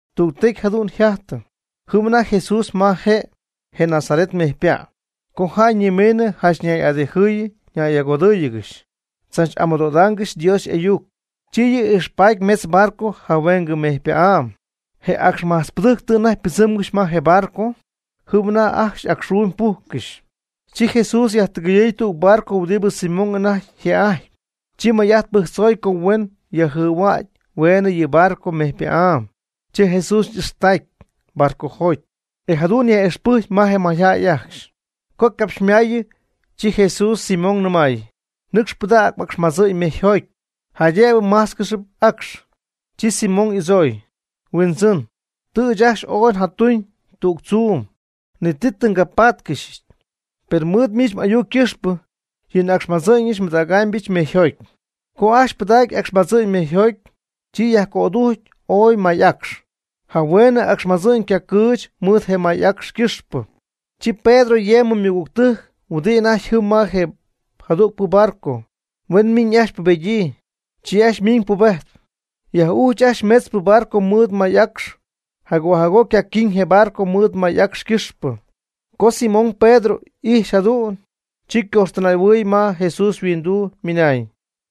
Tügtecy jadu'n yjajtɨ, jɨm anajty Jesús ma je Genesaret mejypa', co jäy ñimiinɨ janch ñay'adijɨɨy ñay'agodɨ́ɨyɨgɨxy, tzach'amɨdohuaangɨxy Dios y'ayuc. Chi yɨ' ijxpaty mejtz barco jahueengɨ mejypa'áy. Je acxmajtzpɨdɨjc tɨ anajty ypɨdzɨ́mgɨxy ma je barco, jɨm anajty y'acxxuumy pújccɨxy. Chi Jesús yajtɨgɨyɨɨy tüg barco huɨdi Simón anajty je'ajtpy. Chi may'ajt pɨjctzoy co huen yajjɨhuägy hueenɨ yɨ barco mejypa'áy. Chi Jesús y'ixtacy barcojoty, e jadu'n yaj'ixpɨjcy je mayjäy ajcxy. Co ycapxymaayɨ, chi Jesús Simón nɨmay: ―Nɨcx pɨdäg m'acxmadzɨ'ñ mejyjoty, jaydëbɨ májtzcɨxɨpy acx. Chi Simón y'adzooy: ―Huindzɨn, tɨ ɨɨch ajcxy ooy njatuñ tüg tzuum, ni ti tɨ ngapáatcɨxyɨch. Per mɨɨd miich m'ayuc ycɨxpɨ yɨ acxmadzɨ'ñ nbɨdägɨbɨch mejyjoty. Co ajcxy pɨdacy je acxmadzɨ'ñ mejyjoty, chi yajco'adujcy ooy may acx, jahueenɨ acxmadzɨ'ñ ycacɨɨch mɨɨd je may acx ycɨxpɨ. Chi Pedro yemɨ ymɨgügtɨjc huɨdi anajty jɨm ma je jadügpɨ barco, huen miñ ajcxy pubedyii. Chi ajcxy ymiñ pubejtp, yaj'ujch ajcxy metzpɨ barco mɨɨd may acx, jagoo jagoo ycaquiiñ je barco mɨɨd may acx ycɨxpɨ. Co Simón Pedro ijxy jadu'n, chi ycojxtɨnaay'ahuɨɨy ma Jesús yhuinduu, nɨmay: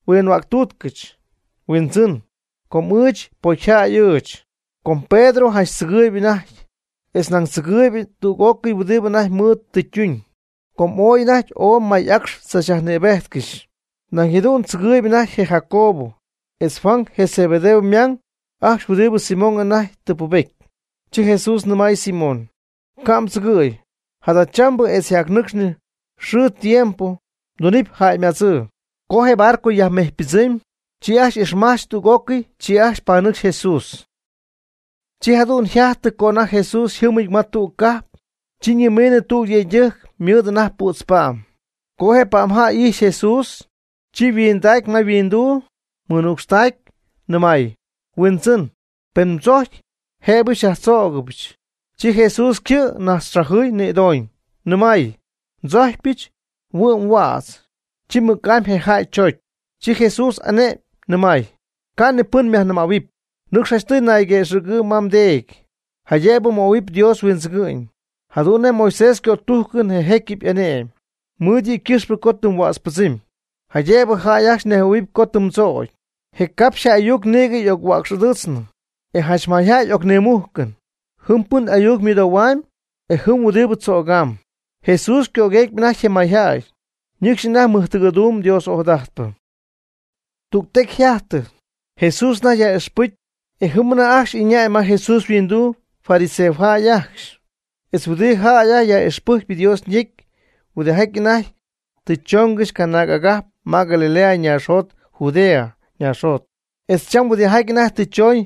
―Huinhuäctúutcɨch, Huindzɨn, com ɨɨch pocyjäy ɨɨch. Com Pedro janch tzɨgɨɨyb anajty, etz nañ tzɨgɨɨyb tüg'ócɨy huɨdi anajty mɨɨd tɨ ytuñ, co anajty ooy may acx tzachyajnïbéjtcɨxy. Nañ jadu'n tzɨgɨɨyb anajty je Jacobo etz Juan je Zebedeo ymang ajcxy huɨdibɨ Simón anajty tɨ pubety. Chi Jesús ñɨmay Simón: ―Ca' mdzɨgɨ̈y, jadachambɨ etz jacnɨcxnɨ xɨɨ tiempo mdunɨpy jäymadzɨɨ. Co je barco yajmejypɨdzɨmy, chi ajcxy y'ixmajch tüg'ócɨy, chi ajcxy panɨcxy Jesús. Chi jadu'n yjajtɨ co anajty Jesús yjɨ́mɨty ma tüg cajp, co ñimiinɨ tüg yëydɨjc ymɨɨd anajty pützpa'm. Co je pa'mjäy ijxy Jesús, chi nihuindacy ma yhuinduu, mɨnucxtacy, nɨmay: ―Huindzɨn, pen mdzojcpy jëbɨ xyajtzögɨbɨch. Chi Jesús ycɨ' najtzxajɨɨy nïdooñ, nɨmay: ―Ndzojcpyɨch, huɨ'm huädz. Chi mɨc'amy je jäy choocy. Chi Jesús ane'my, nɨmay: ―Ca' ni pɨn myajnɨmähuɨpy, nɨcx janchtɨy nayguëxɨ̈gɨɨb ma teedy, jaydëbɨ möhuɨpy Dios huindzɨgɨ'ñ, jadu'n nej Moisés ycötújcɨn je jécyɨp y'ane'my, mɨɨd yɨ' ycɨxpɨ co tɨ mhuätzpɨdzɨmy, jaydëbɨ jäy ajcxy nejhuɨ̈huɨpy co tɨ mdzögy. Je capxy'ayuc nïgɨ y'oc-huäcx'adɨɨtznɨ, e janch mayjäy y'ocnimújcɨn, jɨm pɨn ayuc mɨdohuaam, e jɨm huɨdi tzögaam. Jesús ycögueecpy anajty je mayjäy, ñɨcxy anajty mɨjtɨgɨ̈duum Dios ojadajtpɨ. Tüg tecy yjájtɨ, Jesús anajty yaj'ixpɨjcp, e jɨm anajty ajcxy ɨñäy ma Jesús yhuinduu fariseojäy ajcxy, etz huɨdi jäy yaj'ixpɨjcp Dios ñecy huɨdijaty anajty tɨ choongɨxy canaag agajp ma Galilea naaxjot Judea naaxjot, etz cham huɨdijaty anajty tɨ chooñ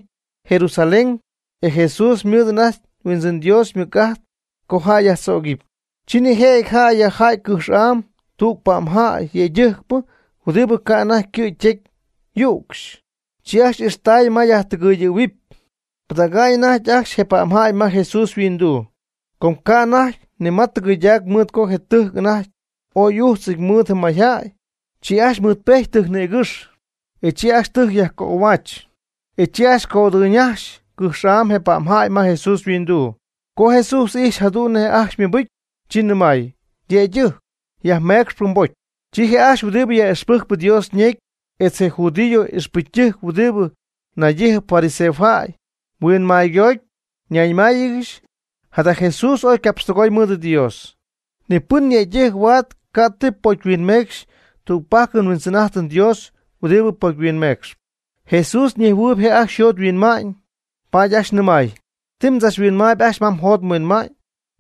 Jerusalén. E Jesús ymɨɨd anajty Huindzɨn Dios ymɨc'ajt co jäy yajtzögɨpy. Chi nijëjɨty jäy yajja'ty cɨjx'am tüg pa'mjäy yëydɨjcpɨ huɨdi ca' anajty ycɨ' ytecy yücxy. Chi ajcxy ixtaay ma yajtɨjctɨgɨ̈huɨpy pɨdäga'ñ anajty ajcxy je pa'mjäy ma Jesús yhuinduu. Com ca' anajty ni ma tɨgɨyɨydac mɨɨd co je tɨjc anajty ooy y'újtzɨty mɨɨd mayjäy. Chi ajcxy mɨɨdpejty tɨjc nïgɨ́xy, chi ajcxy tɨjc yajcöhuach, e chi ajcxy cödɨyñajxy cɨjx'am je pa'mjäy ma Jesús yhuinduu. Co Jesús ijxy jadu'n nej je' ajcxy ymɨbɨcy, chi nɨmay: ―Yëydɨjc, yajmeecxp mbocy. Chi je' ajcxy huɨdi yaj'ixpɨjcpy Dios ñecy etz je judío ixpɨcytɨjc huɨdi naydíjɨgɨxp fariseojäy huinmaygoty, ñayñɨmáayɨgɨxy: “Jada Jesús ooy ycapxtɨgoy mɨɨd Dios. Ni pɨn yëydɨjc huaad ca' ti pocymeecxy. Tügpajc nHuindzɨn'ájtɨm Dios huɨdi pocyhuinmecxp.” Jesús ñejhuɨɨy je' ajcxy yjot yhuinma'ñ, paady ajcxy nɨmay: ―¿Ti mdzachhuinmaayb ajcxy ma mjot mhuinma'ñ?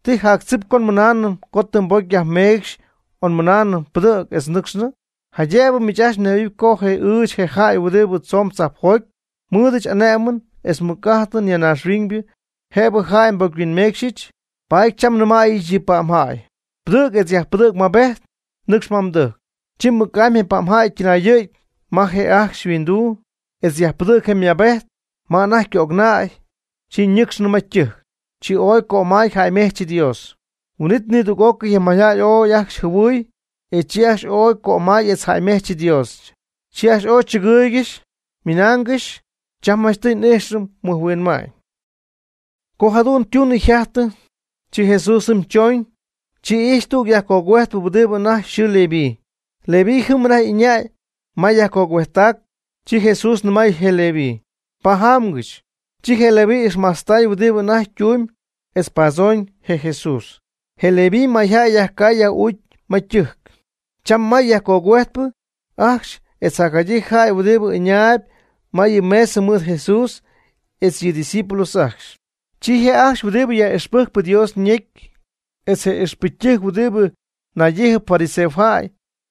¿Ti jactzip co mɨnaanɨm co tɨ mbocy yajmeecxy o mɨnaanɨm: “Pɨdɨ̈g etz nɨcxnɨ”? Jaydëbɨ miich ajcxy mnejhuɨ̈huɨpy co ɨɨch je' je jäy huɨdi tzoon tzajpjoty, nmɨ́ɨdɨch ané'mɨn etz mɨc'ajt ya naaxhuiñ jëbɨ jäy nbocyhuinmeecxyɨch, paady cham nnɨmäyɨch yɨ pa'mjäy: “Pɨdɨ̈g etz yajpɨdɨ̈g mmaabejt, nɨcx ma mdɨjc.” Chi mɨc'amy je pa'mjäy ytɨnayɨ̈gy ma je jäy ajcxy yhuinduu, etz yajpɨdɨ̈gy je' ymaabejt ma anajty ycögnäy. Chi ñɨcxnɨ ma ytɨjc, chi ooy cömay jäymejch Dios. Huin'it nidüg'ócɨy je mayjäy ooy ajcxy jɨhuɨɨy, e chi ajcxy ooy cömay etz jäymejch Dios. Chi ajcxy ooy chɨgɨɨygɨxy, ymɨnaangɨxy: ―Cham janchtɨy n'íjxɨm mɨjhuinma'ñ. Co jadu'n ytunɨ yjajtɨ, chi Jesús jɨm choñ, chi ijxy tüg yajcogüejtpɨ huɨdi anajty yxɨɨ Leví. Leví jɨm anajty ɨñäy ma yajgogüejttac. Chi Jesús nɨmay je Leví: ―Pajaamgɨch. Chi je Leví ixmajtztay huɨdi anajty ytuumyb etz padzooñ je Jesús. Chi Leví mayjäy yajcay yaj'uucy ma ytɨjc, cham may yajcogüejtpɨ ajcxy etz jacjadyii jäy huɨdi ɨñaayb ma yɨ mesa mɨɨd Jesús etz yɨ' ydiscípulos ajcxy. Chi je' ajcxy huɨdibɨ yaj'ixpɨjcp Dios ñecy etz je ixpɨcytɨjc huɨdi naydíjɨgɨxp fariseojäy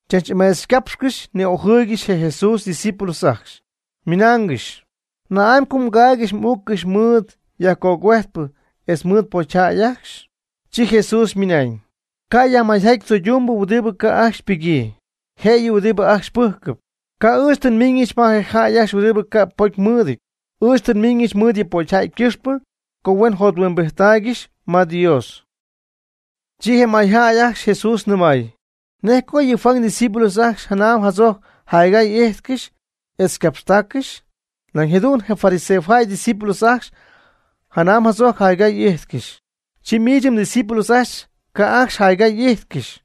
tzachni'ameechycápxcɨxy ni'ojɨɨygɨxy je Jesús ydiscípulos ajcxy, ymɨnaangɨxy: ―¿Na'amy co mgaaygɨxy m'uuccɨxy mɨɨd yajcogüejtpɨ etz mɨɨd pocyjäy ajcxy? Chi Jesús ymɨnañ: ―Ca' yajmayjaty tzoydumbɨ huɨdibɨ ca' ajcxy ypɨgyii, jëyɨ huɨdi ajcxy pɨ́jcɨp. Ca' ɨɨch tɨ nmiñɨch ma je jäy ajcxy huɨdibɨ ca' pocy mɨɨdɨty. Ɨɨch tɨ nmiñɨch mɨɨd yɨ pocyjäy ycɨxpɨ co huen jothuimbijttaaygɨxy ma Dios. Chi je mayjäy ajcxy Jesús nɨmay: ―Nej co yɨ' (Juan) ydiscípulos ajcxy janam jadzojc jaygay y'íjtcɨxy etz ycapxtáccɨxy, nañ jadu'n je fariseojäy ydiscípulos ajcxy janam jadzojc jaygay y'íjtcɨxy. Chi miich mdiscípulos ajcxy ca' ajcxy jaygay y'ijtcɨxy,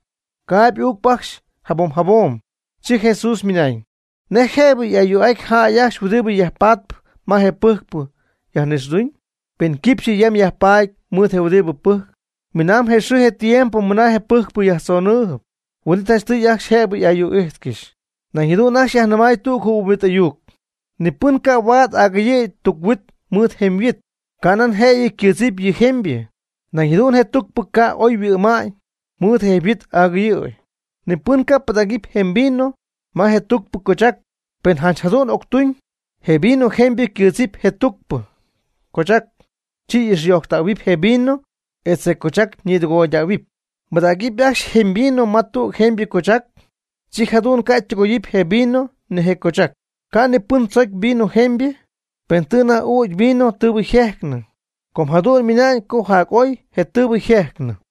caaby uucp ajcxy jabom jabom. Chi Jesús ymɨnañ: ―¿Nej jëbɨ yaj'ayuu'aty jäy ajcxy huɨdi yajpatpɨ ma je pɨjcpɨ yajnixɨɨduñ, pen quipxyɨ yam yajpaady mɨɨd je huɨdibɨ pɨjcp? Minamb je xɨɨ je tiempo mɨna je pɨjcpɨ yajtzonɨɨyb, huin'it janchtɨy ajcxy jëbɨ y'ayuu'ájtcɨxy. Nañ jadu'n ajcxy yajnɨmay tüg jɨhuimbit ayuc: ―Ni pɨn ca' huaad agɨyɨ̈y tuc-huit mɨɨd jemyhuit, canaan jëyɨ ycɨ́ɨdzɨp yɨ jemybɨ, nañ jadu'n je tucpɨ ca' oy yhuɨ'ma'ñ mɨɨd je jemyhuit agɨyɨ'ñ. Ni pɨn ca' pɨdägy jemy vino ma je tucpɨ cochac, pen janch jadu'n octuñ, je vino jemybɨ ycɨ́ɨdzɨp je tucpɨ cochac, chi y'ixyojctähuɨpy je vino etz je cochac ñitɨgoydähuɨpy. Pɨdägɨpy ajcxy jemy vino ma tüg jemybɨ cochac, chi jadu'n ca' ytɨgoyɨpy je vino ni je cochac. Ca' ni pɨn tzocy vino jemybɨ, pen tɨ anajty ügy vino tɨɨbɨ yjejcnɨ, co jadu'n ymɨna'ñ co jac oy je tɨɨbɨ yjejcnɨ.